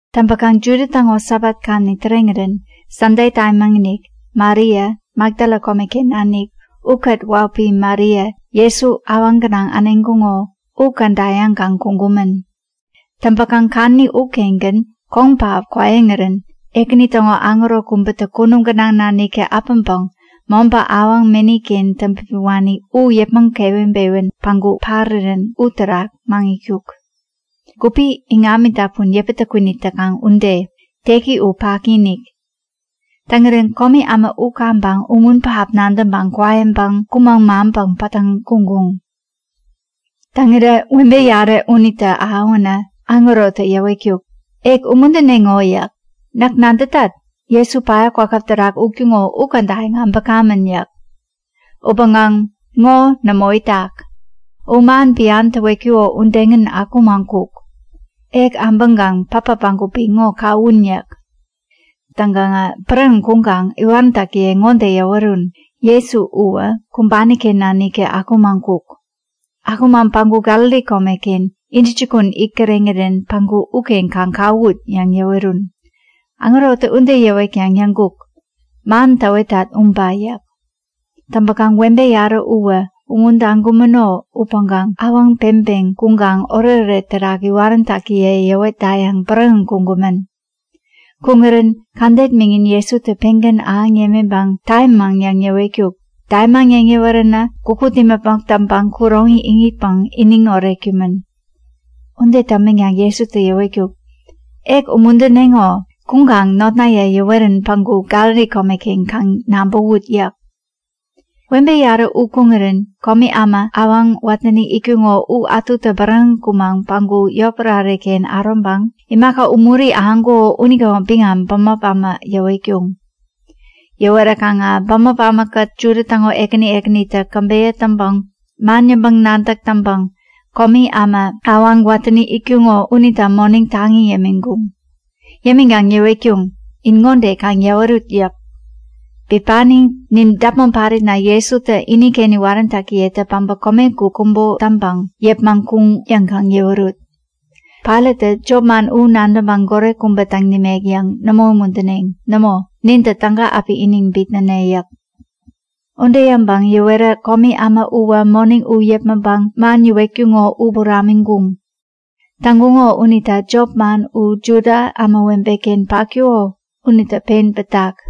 Täŋpäkaŋ Juda täŋo Sabat kadäni täreŋirän Sande tamiinik Maria Makdala komeken nanik ukät wahupi Maria Jesu awaŋ gänaŋ äneŋkuŋo u käda yäŋkaŋ kuŋkumän. Täŋpäkaŋ kadäni ukengän koŋ pähap kwaiŋirän Ekäni täŋo aŋero kubätä kunum gänaŋ naniktä äpäŋpäŋ mobä awaŋ meni-ken täŋpipiwani u yäpmäŋ keweŋpewän päŋku parirän uterak maŋitkuk. Gupi iŋami dapun yäpätä kwinit täkaŋ ude. Teki u paki-inik. Täŋirän komi äma u kaŋpäŋ umun pähap nadäŋpäŋ kwaiŋpäŋ kumäŋ maŋpäŋ pattäŋ kuŋkuŋ. Täŋirä webe yarä unitä ahäwänä aŋerotä yäwetkuk; Ek umuntädeŋo yäk. Näk nadätat, Jesu päya kwakäp terak utkuŋo u kädayäŋ äbäkamän yäk. Upäŋkaŋ ŋo nämo itak. U man bian täwetkuko udegän akumaŋ kuk. Ek abäŋkaŋ patpat bägupi ŋo kawun yäk. Täŋkaŋä bäräŋeŋ kuŋkaŋ iwaräntäkiye ŋode yäwerun; Jesu uwä kumbani-ken naniktä akumaŋ kuk. Akumaŋ päŋku Galili komeken intäjukun it kireŋirän päŋku uken kaŋ kawut! yäŋ yäwerun. Aŋerotä ude yäwetkaŋ yäŋkuk; Man täwetat uba yäk. Täŋpäkaŋ webe yarä uwä umuntaŋkumäno upäŋkaŋ awaŋ peŋpeŋ kuŋkaŋ oretoret terak iwaräntäkiye yäwetdayäŋ bäräŋeŋ kuŋkumän. Kuŋirän kädet miŋin Jesutä pengän ahäŋ yämiŋpäŋ tamimaŋ yäŋ yäwetkuk. Tamimaŋ yäŋ yäweränä gukut imäpmok täŋpäŋ kuroŋi iŋitpäŋ iniŋ oretkumän. Ude täŋpänkaŋ Jesutä yäwetkuk; Ek umuntädeŋo! Kuŋkaŋ notnaye yäwerän päŋku Galili komeken kaŋ nabäwut yäk. Webe yarä u kuŋirän komi äma awaŋ watäni itkuŋo u ätutä bäräŋeŋ kumaŋ päŋku yotpärare-ken äroŋpäŋ imaka umuri ahäŋkuko unitäŋo biŋam bämop äma yäwetkuŋ. Yäweräkaŋä bämop ämakät Juda täŋo ekäni ekänitä käbeyä täŋpäŋ man yäŋpäŋ-nadäk täŋpäŋ komi äma awaŋ watäni itkuŋo unita moneŋ taŋi yämiŋkuŋ. Yämiŋkaŋ yäwetkuŋ; In ŋode kaŋ yäwerut yäk. Bipani nin däpmon paritna Jesutä iniken iwaräntäkiyetä päbä komegup kubo täŋpäŋ yäpmäŋ kuŋ yäŋ kaŋ yäwerut. Pailattä jopman u nadäŋpäŋ goret kubä täŋ nimek yäŋ nämo umuntäneŋ. Nämo, nintä täga api iniŋ bitnäne yäk. Ude yäŋpäŋ yäwerä komi äma uwä moneŋ u yäpmäŋpäŋ man yäwetkuŋo u buramiŋkuŋ. Täŋkuŋo unita jopman u Juda ämawebe-ken patkuko unitä pen pätak.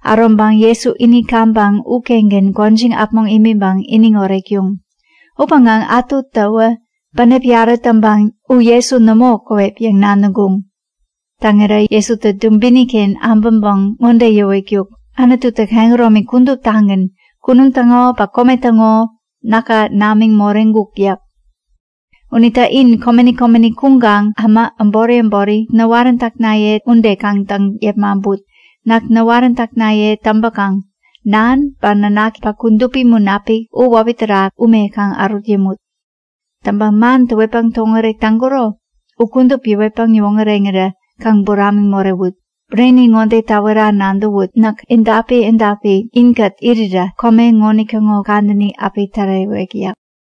Äroŋpäŋ Jesu ini kaŋpäŋ ukengän gwäjiŋ äpmoŋ imiŋpäŋ iniŋ oretkuŋ. Upäŋkaŋ ätutäwä bänep yarä täŋpäŋ U Jesu nämo käwep yäŋ nadäŋkuŋ. Täŋirä Jesutä dubini-ken äbäŋpäŋ ŋode yäwetkuk; Anututä kehäromi kuduptagän, kunum täŋo ba kome täŋo, näka namiŋ moreŋkuk yäk. Unita in komeni komeni kuŋkaŋ äma äbori äbori näwaräntäknaye ude kaŋ täŋ yepmaŋput. Näk näwaräntäknaye täŋpäkaŋ Nan ba Nanaki ba Kudupi Munapik u wäpi terak ume kaŋ ärut yämut. Täŋpäŋ man täwetpäŋ täwoŋärek täŋkuro u kudup yäwetpäŋ yäwoŋäreŋirä kaŋ buramiŋ morewut. Bureni ŋode täwera nadäwut; Näk edapi edapi inkät irira kome ŋonitäŋo kadäni api tärewek yäk.